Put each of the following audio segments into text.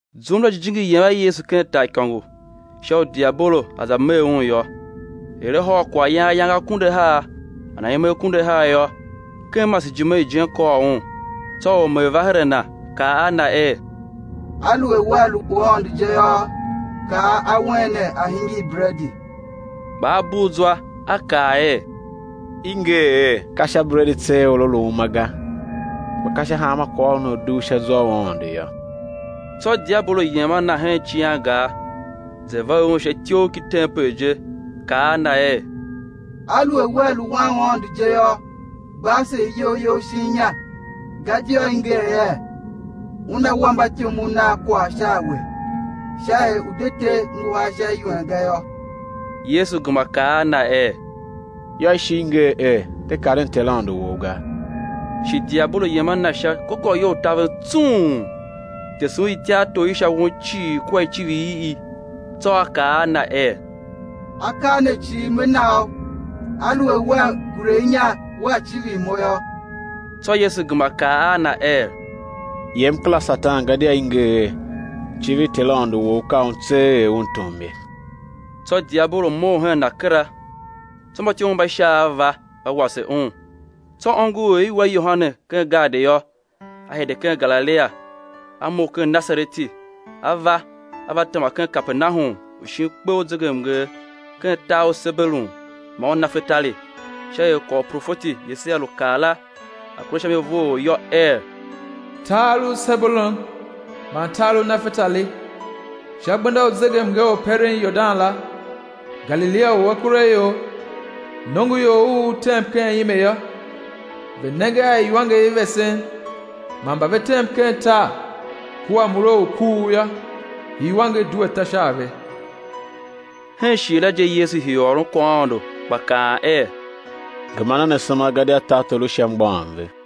Zum la Jijingi yem a Yesu ken taaikôngo, sha u diabolo a̱ za mee Un yô. Er A hôr kwaghyan ayange akunduahar man aime akunduahar yô, ken masejime ijen kôr Un. Tsô ormee va her a Na, kaa a Na er: Aluer Wea lu Wan u Aôndo je yô, kaa awen ne a̱ hingir bredi. Kpa A bugh zwa A kaa er: I nger er: Ka sha bredi tseegh or á lu uma ga, kpa ka sha hanma kwaghôron u a dugh sha zwa u Aôndo yô. Tsô diabolo yem a Na hen icighangar, za ver Un sha ityough ki tempel je, kaa a Na er: Aluer Wea lu Wan u Aôndo je yô, gba ase iyol You shin inya, gadia i nger er: Una wa mbatyomov nav kwagh sha a We, sha er U̱ de te nguhar sha iwen ga yô. Yesu gema kaa a na er: Yô, i shi i nger er: De karen Ter, Aôndo wou, ga. Shi diabolo yem a Na sha gôgôwo u taven tsung, tese Un ityartor i sha won cii kua icivir i i, tsô a kaa a na er: Akaa ne cii me na U, aluer Wea gure inya, Wea civir mo yô. Tsô Yesu gema kaa a na er: Yem kera, Satan, gadia i nger er: Civir Ter, Aôndo wou, ka Un tseegh er Un tom ye. Tsô diabolo mough hen Na kera; tsô mbatyomov mba Shaav va, va wase Un. Tsô ongo er i wa Yohane ken gaadi yô, a hide ken Galilia; A mough ken Nasareti, A va A va tema ken Kapernahum u shin kpe u zegemnger, ken tar u Sebulon man Nafetali, sha er kwagh u profeti Yesaia lu kaa la, a̱ kure sha mi vough yô, er: Tar u Sebulon man tar u Nafetali, sha gbenda u zegemnger u peren Yordan la, Galilia u akuraior. Nongoior u u tem ken ime yô, ve nenge a iwanger i vesen, man mba ve tem ken tar kua mure u kuugh yô, iwanger due ta sha a ve. Hen shighe la je Yesu hii u ôron kwaghaôndo, gba kaan er: Gema nen asema, gadia tartor u Sha mgbôghom ve.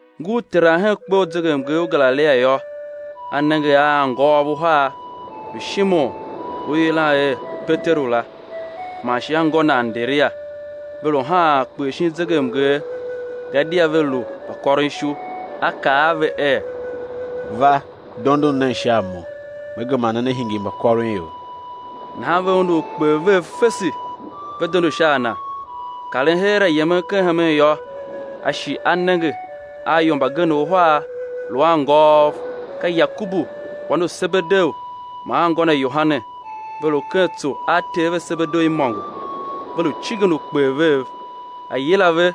Ngur teran hen kpe u zegemnger u Galilia yô, A nenge a anngôôv uhar, lu Shimon u i yilan er, Peteru la, man shi anngô na Anderia, ve lu haan ukper shi zegemnger, gadia ve lu mbakôron ishu. A kaa a ve er: Va, dondon nen sha a Mo, Me gema ne, né hingir mbakôronior. Nahan ve undu ukper vev fese, ve dondo sha a Na. Karen heera yemen ken hemen yô, A shi A nenge a ior mbagenev uhar, lu anngôôv, ka Yakobu wan u Sebedeu man anngô na Yohane, ve lu ken tsô a ter ve Sebedeu imôngo, ve lu cingen ukper vev. A yila ve.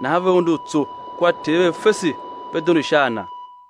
Nahan ve undu tso kua ter ve fese, ve dondo sha a Na.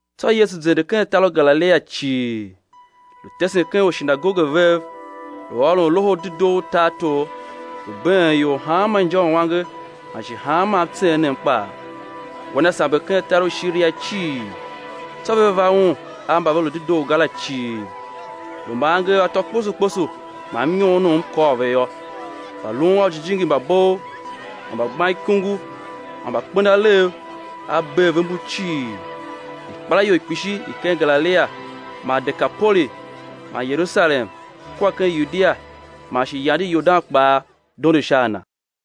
Tsô Yesu zende ken tar u Galilia cii, lu tesen ken ushinagoge vev, lu ôron Loho u Dedoo u tartor, lu been ior hanma injauange man shi hanma mtseenem kpaa. Gwa Na samber ken tar u Shiria cii, tsô ve va Un a mba ve lu dedoo ga la cii, lu mba angev atô kposo kposo man mnyoonom kôr ve yô, mbalun a ujijingi mba bov man mbagbanikungu man mbakpenalegh; A bee ve mbu cii. Ikpelaior kpishi i ken Galilia man Dekapoli man Yerusalem kua ken Yudia man shi yande Yordan kpaa, dondo sha a Na.